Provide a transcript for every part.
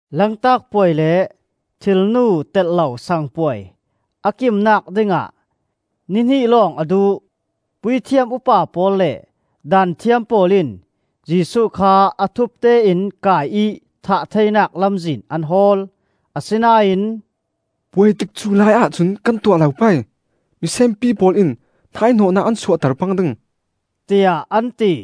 Lantak puai le Thilnu telh lo sang puai a kimnak dingah ni hnih lawng a duh. Puithiam upa pawl le Daanthiam pawl in Jesuh kha a thupte in kai ih thah theinak lamzin an hawl. Asinain, “Puai tikcu lai ahcun kan tuah lo pei, misenpi pawl in hnaihnawhnak an suahter pang ding,” tiah an ti.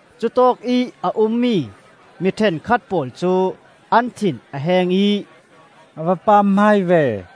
Cutawkih a ummi mi ṭhenkhat pawl cu an thin a heng ih, “A va pamhmai ve!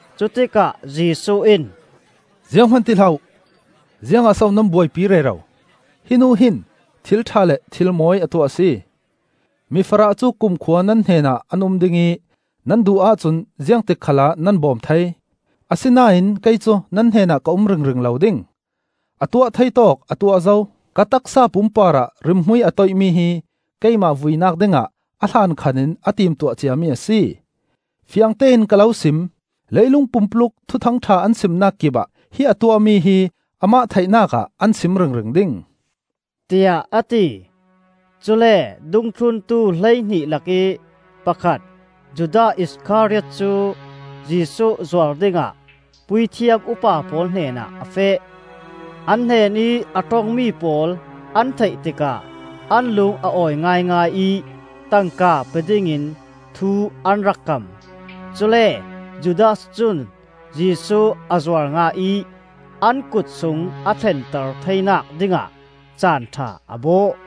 Cutikah Jesuh in, “Zianghman ti hlah uh! Ziangah so nan buaipi rero? Hi nu hin thil ṭha le thil mawi a tuah a si. Mifarah cu kumkhua nan hnenah an um ding ih nan duh ahcun ziangtik khalah nan bawm thei. Asinain kei cu nan hnenah ka um ringring lo ding. A tuah thei tawk a tuah zo. Ka taksa pum parah rimhmui a toihmi hi keimah vuinak dingah a hlankhan in a timtuah ciami a si. Fiangtein ka lo sim: leilung pumpuluk Thuthang ṭha an simnak kipah hi a tuahmi hi amah theihnak ah an sim ringring ding,” tiah a ti. Cule dungthluntu hleihnih lakih pakhat Judas Iskariot cu Jesuh zuar dingah puithiam upa pawl hnenah a feh. An hnenih a ṭongmi pawl an theih tikah an lung a awi ngaingai ih tangka pe dingin thu an rak kam. Cule Judas cun Jesuh a zuar ngah ih an kut sung a thlenter theinak dingah caan ṭha a bawh.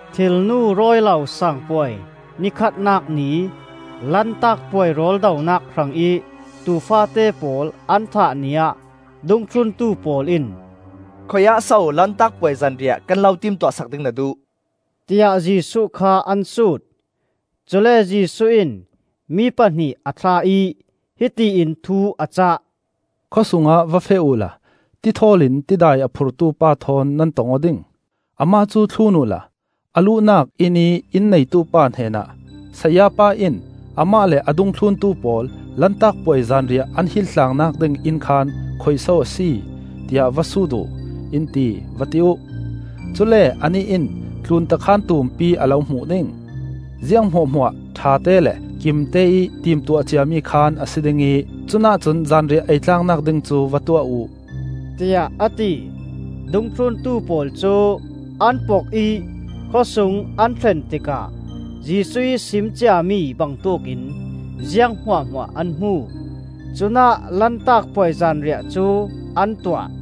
Thilnu rawi lo Sang Puai ni khatnak ni, Lantak Puai rawldonak hrangih tuu faate pawl an thah ni ah dungthluntu pawl in, “Khuiah so Lantak Puai zanriah kan lo timtuah sak ding na duh?” tiah Jesuh kha an sut. Cule Jesuh in mi pahnih a thlah ih hiti in thu a cah, “Khawsung ah va feh uhla tithawl in tidai a phurtu pa thawn nan tong aw ding. Amah cu thlun uhla, a luhnak innih inn neitupa hnenah ‘Sayapa in amah le a dungthluntu pawl Lantak Puai zanriah an hil tlaangnak ding inn khaan khuiso a si? tiah va sut uh, in ti,’ va ti uh. Cule anih in tlunta khaan tumpi a lo hmuh ding. Ziang hmuahhmuah ṭhate le kimteih timtuah ciami khaan a si ding ih cunah cun zanriah ei tlaangnak ding cu va tuah uh,” tiah a ti. Dungthluntu pawl cu an pok ih khawsung an thlen tikah Jesuh ih sim ciami bangtuk in ziang hmuahhmuah an hmu. Cunah Lantak Puai zanriah cu an tuah.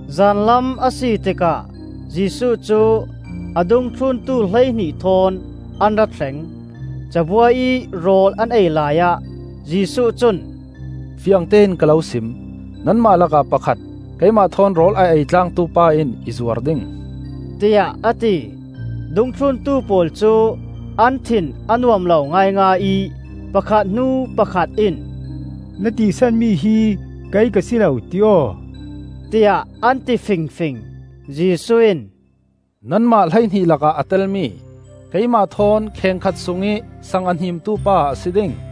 Zanlam a si tikah Jesuh cu a dungthluntu hleihnih thawn an ra thleng. Cabuai ih rawl an ei laiah Jesuh cun, “Fiangtein ka lo sim: Nanmah lakah pakhat, keimah thawn rawl a ei tlangtu pa in i zuar ding,” tiah a ti. Dungthluntu pawl cu an thin a nuam lo ngaingai ih pakhat hnu pakhat in, “Na tisanmi hi kei ka si lo, ti aw?” tiah an ti fingfing. Jesuh in, “Nanmah hleihnih lakah a telmi, keimah thawn kheng khat sungih sang a hnimtu pa a si ding.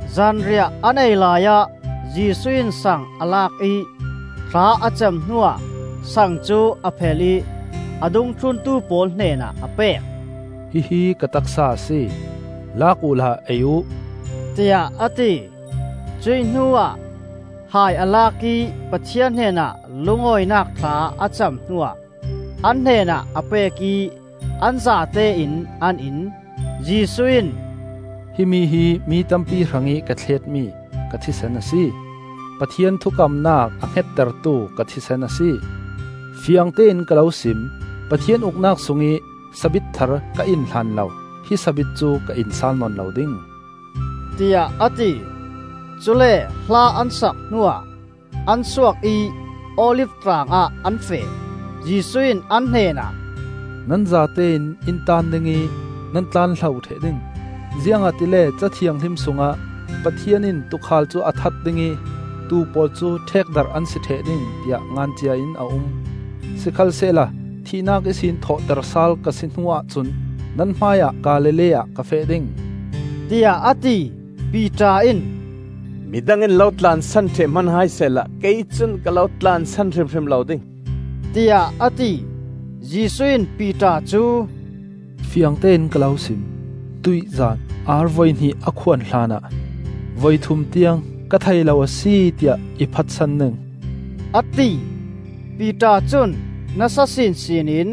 Zanriah an ei laiah Jesuh in sang a lak ih thla a cam hnuah sang cu a phel ih a dungthluntu pawl hnenah a pek. “Hi hi ka taksa a si; Lak uhla ei uh,” tiah a ti. Cuih hnuah hai a lak ih Pathian hnenah lungawinak thla a cam hnuah an hnenah a pek ih an zatein an in. Jesuh in, “Himi hi mi tampi hrangih ka thletmi ka thisen a si; Pathian thukamnak a nemhngettu ka thisen a si. Fiangtein ka lo sim: Pathian Uknak sungih sabit thar ka in hlanlo hi sabit cu ka in sal nawn lo ding,” tiah a ti. Cule hla an sak hnuah an suak ih Olif Tlangah an feh. Jesuh in an hnenah, “Nan zatein in taan ding ih nan tlanhlo ṭheh ding; ziangahtile Ca Thianghlim sungah ‘Pathian in tuukhal cu a that ding ih tuu pawl cu ṭhekdarh an si ṭheh ding,’ tiah ngan cia in a um. Sikhalsehla thihnak ihsin thawhtersal ka si hnuah cun nan hmaiah Galilee ah ka feh ding,” tiah a ti. Piter in, “Midang in lo tlansan ṭheh hman hai sehla kei cun ka lo tlansan hrimhrim lo ding,” tiah a ti. Jesuh in Piter cu, “Fiangtein ka lo sim: tuihzan ar voi hnih a khuan hlanah voi thum tiang ‘Ka thei lo a si,’ tiah i phatsan ding,” a ti. Piter cun nasa sinsin in,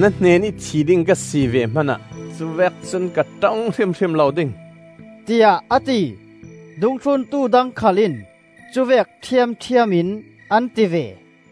“Na hnenih thi ding ka si ve hmanah cu vek cun ka ṭong hrimhrim lo ding,” tiah a ti. Dungthluntu dang khal in cuvek ṭhiamṭhiam in an ti ve.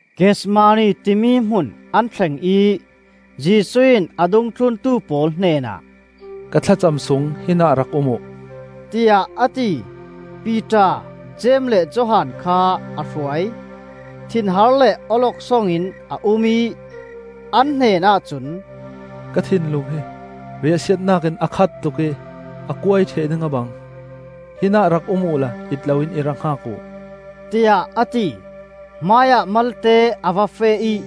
Gethsemane timi hmun an thleng ih Jesuh in a dungthluntu pawl hnenah, “Ka thlacam sung hinah rak um uh,” tiah a ti. Piter, Jeim le Johan kha a hruai. Thinhar le awloksong in a um ih, an hnenah cun, “Ka thinlung hi riahsiatnak in a khat tuk ih a kuai ṭheh ding a bang. Hinah rak um uhla it loin i rak hngak uh,” tiah a ti. Hmaiah malte a va feh ih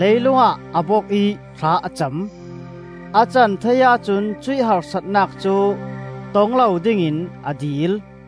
leilung ah a bok ih thla a cam. A can thei ahcun cuih harsatnak cu tong lo dingin a dil.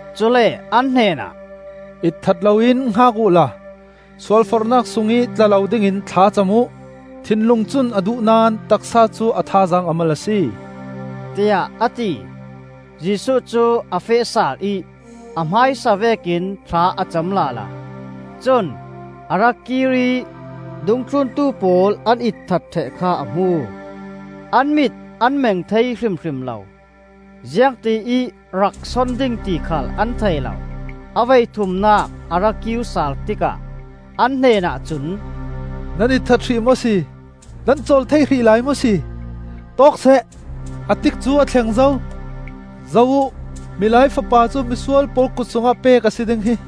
Cule an hnenah, “Itthat loin hngak uhla sualforhnak sungih tla lo dingin thlacam uh. Thinlung cun a duh naón taksa cu a thazaang a mal a si,” tiah a ti. Jesuh cu a feh sal ih a hmaisa vekin thla a cam lala. Cun a ra kir ih dungthluntu pawl an itthat ṭheh kha a hmu; an mit an meng thei hrimhrim lo. Ziangtiih rak son ding ti khal an thei lo. A voithumnak a ra kir sal tikah an hnenah cun, “Nan itthat hrih maw si? Nan cawl thei hrih lai maw si? Tawk seh! A tikcu a thleng zo! Zoh uh! Milai Fapa cu misual pawl kut sungah pek a si ding hi!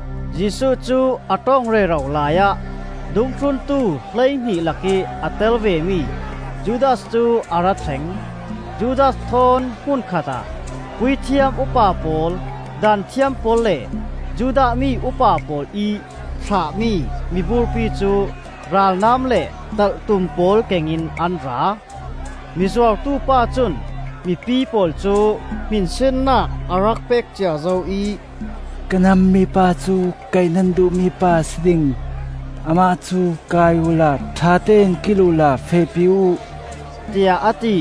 Jesuh cu a ṭong rero laiah dungthluntu hleihnih lakih a tel vemi Judas cu a ra thleng. Judas thawn hmun khatah, puithiam upa pawl, Daanthiam pawl le Judah mi upa pawl ih thlahmi miburpi cu ralnam le talhtum pawl kengin an ra. Mizuartu pa cun mipi pawl cu hminsinnak a rak pek cia zo ih, “Ka hnam mipa cu kaih nan duhmi pa a si ding. Amah cu kai uhla ṭhatein kil uhla fehpi uh,” tiah a ti.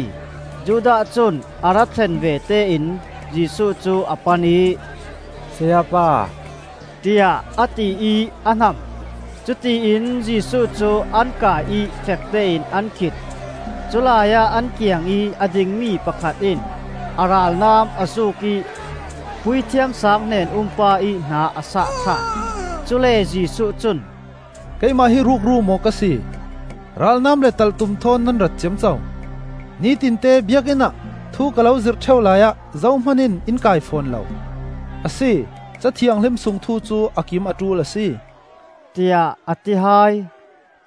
Judas cun a ra thlen vete in Jesuh cu a pan ih, “Sayapa!” tiah a ti ih a hnam. Cutiin Jesuh cu an kai ih fektein an khit. Culai ah an kiangih a dingmi pakhat in a ralnam a zuk ih Puithiam sang hnen-um pa ih hna a sah thlak. Cule Jesuh cun, “Keimah hi rukru maw ka si, ralnam le talhtum thawn nan rat ciamco? Nitinte Biakinn ah thu ka lo zirh ṭheu laiah zohman in in kai fawn lo. Asi, Ca Thianghlim sung thu cu a kim a ṭul a si,” tiah a ti hai.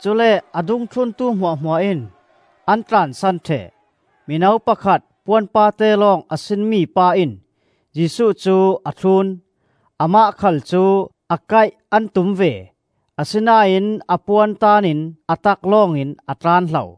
Cule a dungthluntu hmuahhmuah in an tlansan ṭheh. Mino pakhat, puan paate lawng a sinmi pa in Jesuh cu a thlun. Amah khal cu a kaih an tum ve; asinain a puan taan in a tak lawngin a tlanhlo.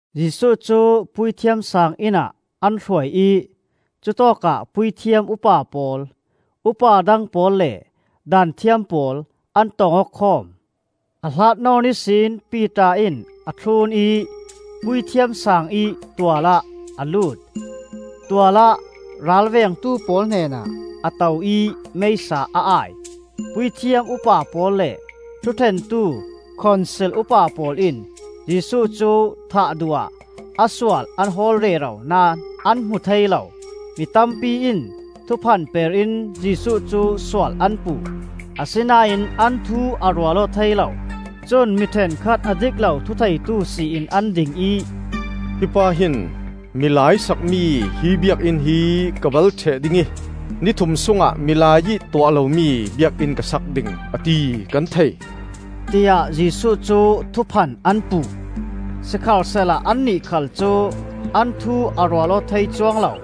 Jesuh cu Puithiam sang inn ah an hruai ih cutawkah puithiam upa pawl, upa dang pawl le Daanthiam pawl an tong aw khawm. A hlat nawn ihsin Piter in a thlun ih Puithiam Saang ih tual ah a lut. Tual ah ralvengtu pawl hnenah a to ih meisa a ai. Puithiam upa pawl le thuṭhentu Khonsil upa pawl in Jesuh cu thah duh ah a sual an hawl rero naón an hmu thei lo. Mi tampi in thuphan per in Jesuh cu sual an puh, asinain an thu a rual aw thei lo. Cun mi ṭhenkhat, a dik lo thutheitu si in an ding ih, “Hi pa hin ‘Milai sakmi hi Biakinn hi ka bal ṭheh ding ih ni thum sungah milai ih tuah lomi Biakinn ka sak ding,’ a ti, kan thei,” tiah Jesuh cu thuphan an puh. Sikhalsehla annih khal cu an thu a rual aw thei cuang lo.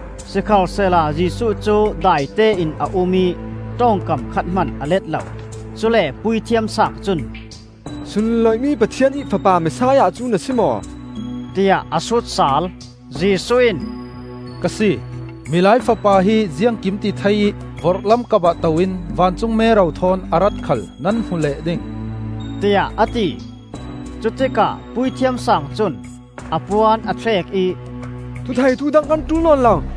Sikhalsehla Jesuh cu daitein a um ih ṭong kam khat hman a let lo. Cule Puithiam Saang cun, “Sunloih mi Pathian ih Fapa Messiah cu na si maw?” tiah a sut sal. Jesuh in, “Ka si! Milai Fapa hi Ziangkimtithei ih vorhlam kapah to in vancung mero thawn a rat khal nan hmu leh ding,” tiah a ti. Cutikah Puithiam Saang cun a puan a thlek ih, “Thutheitu dang kan ṭul nawn lo.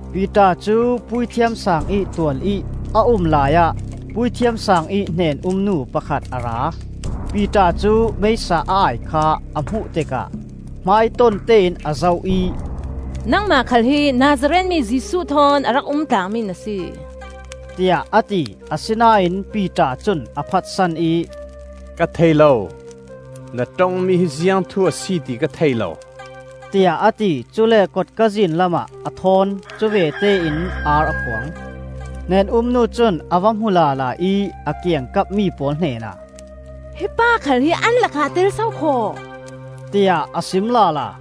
Piter cu Puithiam Saang ih tualih a um laiah Puithiam Saang ih hnen-um nu pakhat a ra. Piter cu meisa a ai kha a hmuh tikah hmaitontein a zoh ih, “Nangmah khal hi Nazareth mi Jesuh thawn a rak um tlangmi na si,” tiah a ti. Asinain Piter cun a phatsan ih, “Ka thei lo. Na ṭongmi hi ziangthu a si ti ka thei lo,” tiah a ti. Cule kotka zin lamah a ṭhawn. Cuvete in ar a khuang. Hnen-um nu cun a va hmu lala ih a kiangkap mi pawl hnenah, “Hi pa khal hi an lakah a tel sokhaw!” tiah a sim lala.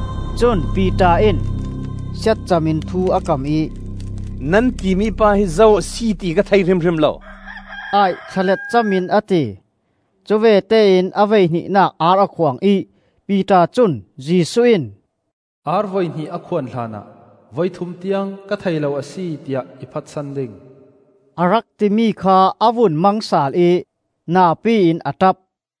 Cun Piter in, siatcam in thu a kam ih, “Nan timi pa hi zo a si ti ka thei hrimhrim lo,” tiah thlalet cam in a ti. Cuvete in a voihnihnak ar a khuang ih Piter cun Jesuh in, “Ar voi hnih a khuan hlanah voi thum tiang ‘Ka thei lo a si,’ tiah i phatsan ding,” a rak timi kha a vun mang sal ih napi in a ṭap.